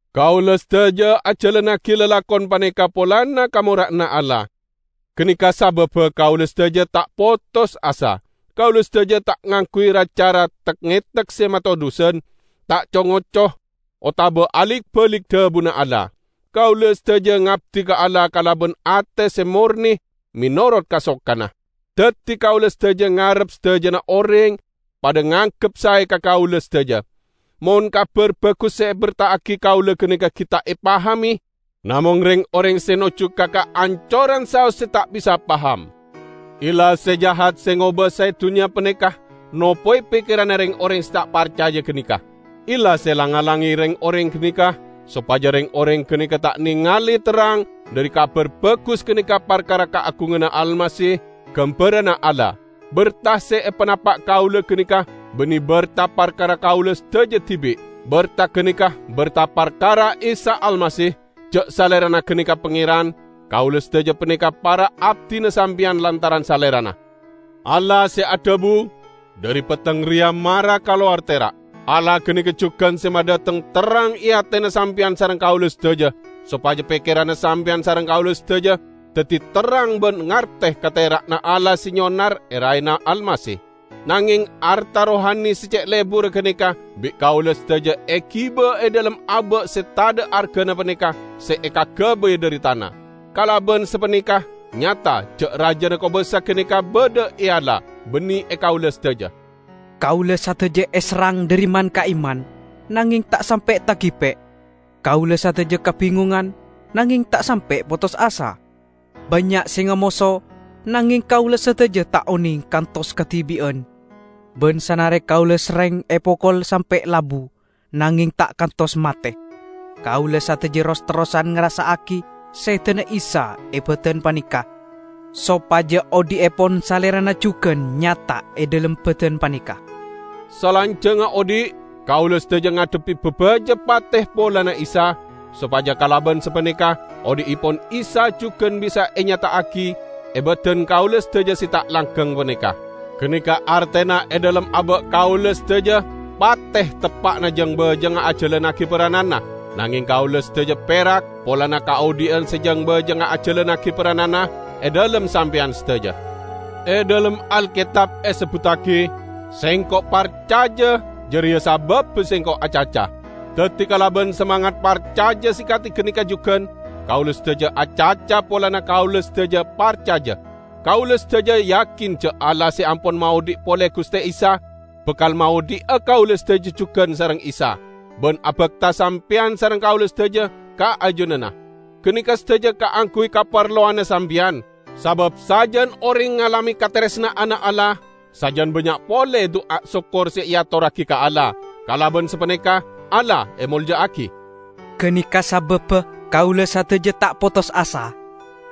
Kaula sadaja ajalannagi lalakon paneka polana kamora'anna Allah. Ganeka sababba kaula sadaja ta' potos asa. Kaula sadaja ta' ngangguy ra-cara tek-ngetek se matodhusan; ta' co-ngoco otaba alik-balik dhabuna Allah. Kaula sadaja ngabdi ka Allah kalaban ate se morne menorot kasokanna. Daddi kaula sadaja ngarep sadajana oreng padha nganggep sae ka kaula sadaja. Mon Kabar Bagus se eberta'agi kaula ganeka gi' ta' epahame, namong reng-oreng se nojju ka kaancoran saos se ta' bisa paham. Illah se jahat se ngobasae dunnya paneka nopowe pekkeranna reng-oreng se ta' parcaja ganeka. Illah se lang-ngalange reng-oreng ganeka sopaja reng-oreng ganeka ta' nengale terrang dhari Kabar Bagus ganeka parkara kaagunganna Almasih, gambaranna Allah. Berta se epanapa' kaula ganeka banne berta parkara kaula sadaja dibi'. Berta ganeka berta parkara Isa Almasih; ja' Salerana ganeka Pangeran; kaula sadaja paneka para abdina sampeyan lantaran Salerana. Allah se adhabu, "Dhari petteng reya mara kalowar tera'," Allah ganeka jugan se madhateng terrang e atena sampeyan sareng kaula sadaja, sopaja pekkeranna sampeyan sareng kaula sadaja daddi terrang ban ngarte ka tera'na Allah se nyonar e raena Almasih. Nangeng arta rohani se ce' leburra ganeka bi' kaula sadaja egiba e dhalem aba' se tadha' argana paneka se ekagabay dhari tana. Kalaban sapaneka nyata ja' rajana kobasa ganeka badha e Allah, banne e kaula sadaja. Kaula sadaja eserrang dhari man-ka'imman, nangeng ta' sampe' tagipe'. Kaula sadaja kabingongan, nangeng ta' sampe' potos asa. Bannya' se ngamoso, nangeng kaula sadaja ta' oneng kantos kadibi'an. Ban sanare kaula serreng epokol sampe' labu, nangeng ta' kantos mate. Kaula sadaja ros-terrosan ngarassa'agi sedana Isa e badan paneka, sopaja odhi'epon Salerana jugan nyata e dhalem badan paneka. Salanjangnga odhi', kaula sadaja ngadhebbi babaja pate polana Isa, sopaja kalaban sapaneka odhi'epon Isa jugan bisa enyata'agi e badan kaula sadaja se ta' langgeng paneka. Ganeka artena e dhalem aba' kaula sadaja pate teppa'na jeng-bajengnga ajalannagi perrananna, nangeng kaula sadaja perak polana kaodhi'an se jeng-bajengnga ajalannagi perrananna e dhalem sampeyan sadaja. E dhalem Alketab esebbuttagi, "Sengko' parcaja, jareya sababba sengko' acaca." Daddi kalaban samangat parcaja se kadi ganeka jugan, kaula sadaja acaca polana kaula sadaja parcaja. Kaula sadaja yakin ja' Allah se ampon maodhi' pole Guste Isa, bakal maodhi'a kaula sadaja jugan sareng Isa, ban abakta sampeyan sareng kaula sadaja ka ajunanna. Ganeka sadaja kaangguy kaparlowanna sampeyan. Sabab sajan oreng ngalame kataresna'anna Allah, sajan bannya' pole du'a sokkor se eatorragi ka Allah; kalaban sapaneka Allah emolja'agi. Ganeka sababba kaula sadaja ta' potos asa.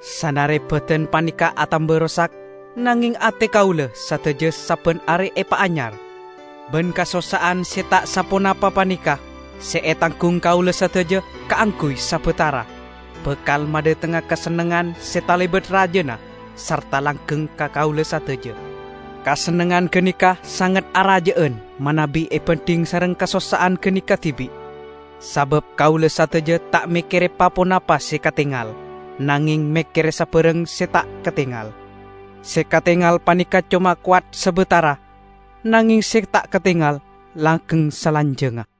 Sanare badan paneka atamba rosak, nangeng ate kaula sadaja sabban are epaanyar. Ban kasossa'an se ta' saponapa paneka, se etanggung kaula sadaja kaangguy sabatara, bakal madhatengnga kasennengngan se talebat rajana sarta langgeng ka kaula sadaja. Kasennengngan ganeka sanget araja'an manabi ebandhing sareng kasossa'an ganeka dibi'. Sabab kaula sadaja ta' mekkere pa-ponapa se katengal, nangeng mekkere sabarang se ta' katengal. Se katengal paneka coma kowat sabatara, nangeng se ta' katengal langgeng salanjangnga.